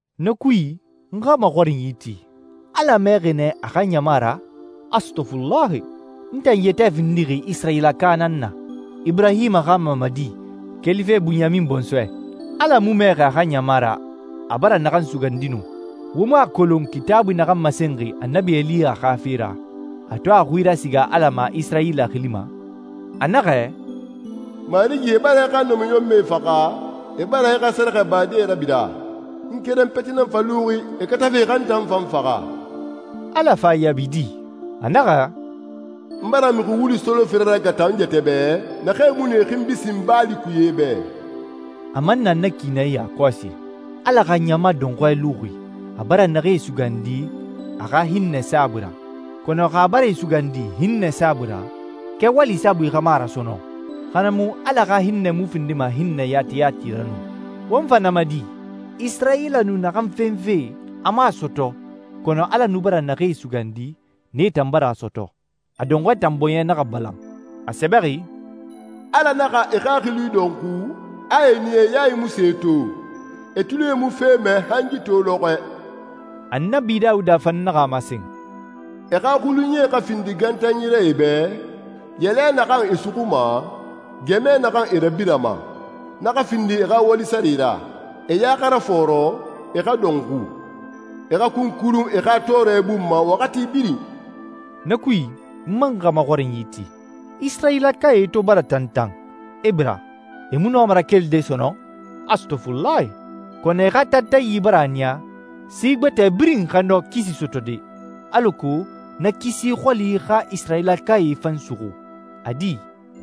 Na kui, n xa maxɔrinyi ti, Ala mɛɛxi nɛ a xa ɲama ra? Astɔfulahi! N tan yɛtɛ findixi Isirayilaka nan na, Iburahima xa mamadi, kelife Bunyamin bɔnsɔɛ. Ala mu mɛɛxi a xa ɲama ra a bara naxan sugandi nu. Wo mu a kolon Kitaabui naxan masenxi Annabi Eliya xa fe ra, a to a xui rasiga Ala ma Isirayila xili ma? A naxɛ, «Marigi, e bara i xa namiɲɔnmɛe faxa, e bara i xa sɛrɛxɛbadee rabira. N keren peti nan fa luxi, e katafe e xa n tan fan faxa.» Ala fa a yaabi di? A naxɛ, «N bara mixi wulu solofere ragata n yɛtɛ bɛ naxee mu nu e xinbi sin Baali kuye bɛ.» A man na na ki nɛ yakɔsi. Ala xa ɲama dɔnxɔɛ luxi, a bara naxee sugandi a xa hinnɛ saabui ra. Kɔnɔ xa a bara e sugandi hinnɛ saabui ra, kɛwali saabui xa mu a ra sɔnɔn, xa na mu Ala xa hinnɛ mu findima hinnɛ yati yati ra nu. Won fa na ma di? Isirayila nu naxan fenfe a mu a sɔtɔ, kɔnɔ Ala nu bara naxee sugandi, nee tan bara a sɔtɔ. A dɔnxɔɛe tan bɔɲɛe naxa balan. A sɛbɛxi, «Ala naxa e xaxili dɔnxu, a a niya e yae mu se to, e tulie mu fe mɛ, han yi to lɔxɔɛ.» Annabi Dawuda fan naxa a masen, «E xa xulunyie xa findi gantanyi ra e bɛ, yɛlɛ naxan e suxuma, gɛmɛ naxan e rabirama. Na xa findi e xa wali sare ra. E ya xa rafɔɔrɔ, e xa dɔnxu. E xa kunkurun e xa tɔɔrɛ bun ma waxati birin.» Na kui, n man xa maxɔrinyi ti, Isirayilakae to bara tantan, e bira, e mu nɔma rakelide sɔnɔn? Astɔfulahi! Kɔnɔ e xa tantanyi bara a niya si gbɛtɛe birin xa nɔ kisi sɔtɔde, alako na kisi xɔli xa Isirayilakae fan suxu. A di,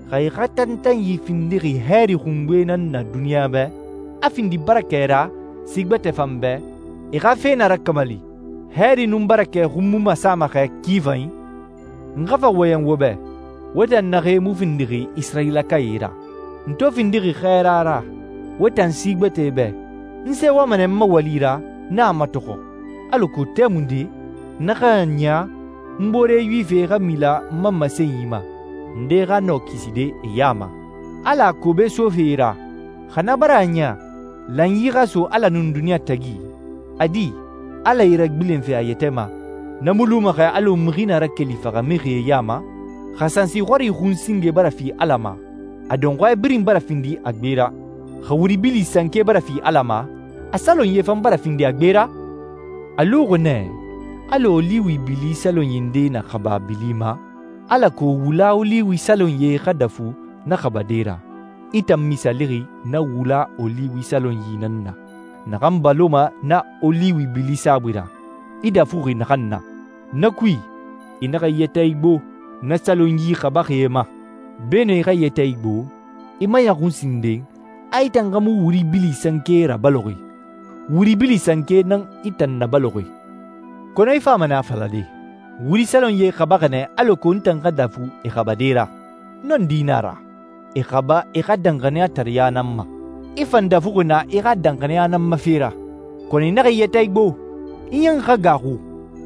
xa e xa tantanyi findixi hɛɛri xungbe nan na duniɲa bɛ, a findi barakɛ ra si gbɛtɛe fan bɛ, e xa fe na rakamali, hɛɛri nun barakɛ xun mu masama xɛ ki fanyi? N xa fa wɔyɛn wo bɛ, wo tan naxee mu findixi Isirayilakae ra. N to findixi xɛɛra ra wo tan si gbɛtɛe bɛ, n sɛɛwama nɛ n ma wali ra, n a matɔxɔ, alako tɛmunde na xa a niya n boore Yuwifie xa mila n ma masenyi ma, ndee xa nɔ kiside e ya ma. Ala a kobe sofe e ra, xa na bara a niya lanyi xa so Ala nun duniɲa tagi, a di, Ala e ragbilenfe a yɛtɛ ma, na mu luma xɛ alɔ mixi na rakeli faxamixie ya ma? Xa sansi xɔri xun singe bara fi Ala ma, a dɔnxɔɛ birin bara findi a gbe ra. Xa wuri bili sanke bara fi Ala ma, a salonyie fan bara findi a gbe ra. A luxi nɛ alɔ oliwi bili salonyi ndee na xaba a bili ma alako wula oliwi salonyie xa dafu na xabade ra. I tan misaalixi na wula oliwi salonyi nan na, naxan baloma na oliwi bili saabui ra, i dafuxi naxan na. Na kui, i naxa i yɛtɛ igbo na salonyi xabaxie ma. Beenun i xa i yɛtɛ igbo, i maɲɔxun sinden, a i tan xa mu wuri bili sanke rabaloxi. Wuri bili sanke nan i tan nabaloxi. Kɔnɔ i fama nɛ a falade, «Wuri salonyie xabaxi nɛ alako n tan xa dafu e xabade ra.» Nɔndi na a ra. E xaba e xa danxaniyatareɲa nan ma, i fan dafuxi naa i xa danxaniya nan ma fe ra. Kɔnɔ i naxa i yɛtɛ igbo. I ɲan xa gaaxu,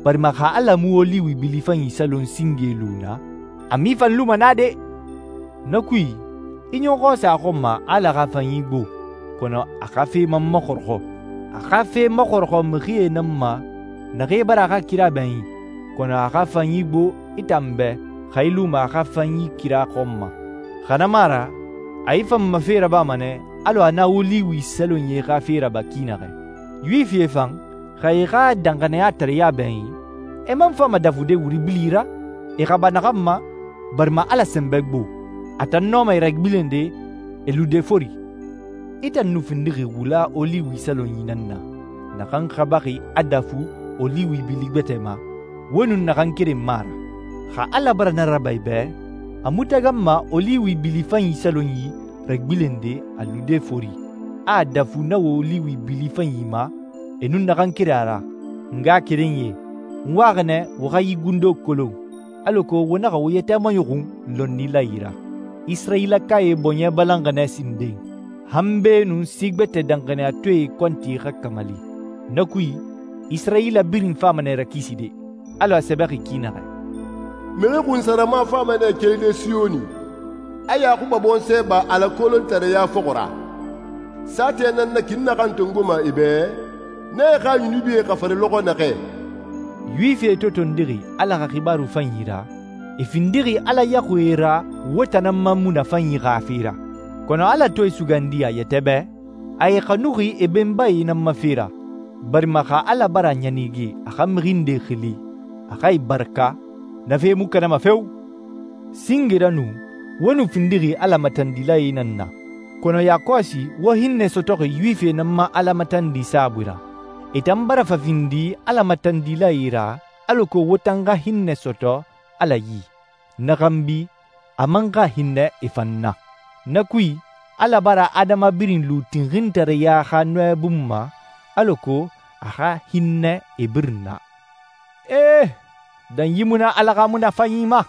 barima xa Ala mu oliwi bili fanyi salon singee lu na, a mu i fan luma na de! Na kui, i ɲɔxɔ sa a xɔn ma a Ala xa fanyi gbo, kɔnɔ a xa fe man maxɔrɔxɔ. A xa fe maxɔrɔxɔ mixie nan ma naxee bara a xa kira bɛɲin, kɔnɔ a xa fanyi gbo i tan bɛ xa i luma a xa fanyi kira xɔn ma. Xa na mu a ra a i fan ma fe rabama nɛ alɔ a na oliwi salonyi xa fe raba ki naxɛ. Yuwifie fan, xa e e xa danxaniyatareɲa bɛɲin, e man fama dafude wuri bili ra, e xaba naxan ma, barima Ala sɛnbɛ gbo. A tan nɔma e ragbilende e lude fori. I tan nu findixi wula oliwi salonyi nan na, naxan xabaxi a dafu oliwi bili gbɛtɛ ma, wo nun naxan keren mu a ra. Xa Ala bara na raba i bɛ, a mu taganma oliwi bili fanyi salonyi ragbilende a lude fori, a a dafu na oliwi bili fanyi ma, e nun naxan keren a ra. N ngaxakerenyie, n waxi nɛ wo xa yi gundo kolon, alako wo naxa wo yɛtɛ maɲɔxun lɔnnilae ra. Isirayilakae bɔɲɛ balanxi nɛ sinden, han beenun si gbɛtɛ danxaniyatɔɛe kɔnti xa kamali. Na kui, Isirayila birin fama nɛ rakiside, alɔ a sɛbɛxi ki naxɛ: «Mixi xunsarama fama nɛ keli Siyoni, a Yaxuba bɔnsɔɛ ba Ala kolontareya fɔxɔ ra. Saatɛ nan na ki n naxan tongoma e bɛ, n na e xa yunubie xafari lɔxɔ naxɛ.» Yuwifie to tondixi Ala xa Xibaaru Fanyi ra, e findixi Ala yaxuie ra wo tan nan ma munafanyi xa fe ra. Kɔnɔ Ala to e sugandi a yɛtɛ bɛ, a e xanuxi e benbae nan ma fe ra, barima xa Ala bara a ɲanige a xa mixi ndee xili, a xa e baraka, na fe mu kanama feo! Singe ra nu wo nu findixi Ala matandilae nan na, kɔnɔ yakɔsi wo hinnɛ sɔtɔxi Yuwifie nan ma Ala matandi saabui ra. E tan bara fa findi Ala matandilae ra alako wo tan xa hinnɛ sɔtɔ Ala yi, na xanbi, a man xa hinnɛ e fan na. Na kui, Ala bara adama birin lu tinxintareya xa nɔɛ bun ma alako a xa hinnɛ e birin na. Ee! Danyi mu na Ala xa munafanyi ma!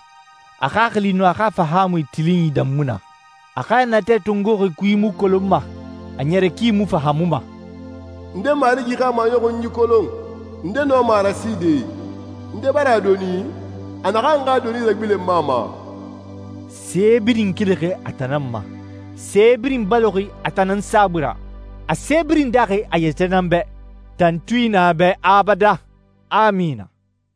A xaxili nun a xa fahaamui tilinyi dan mu na! A xa natɛ tongoxi kui mu kolonma, a ɲɛrɛ ki mu fahaamuma! Nde Marigi xa maɲɔxunyi kolon? Nde nɔma a raside? Nde bara a doni, a naxan xa doni ragbilenma a ma? Se birin kelixi a tan nan ma, se birin baloxi a tan nan saabui ra, a se birin daaxi a yɛtɛ nan bɛ. Tantui na a bɛ abadan! Amina.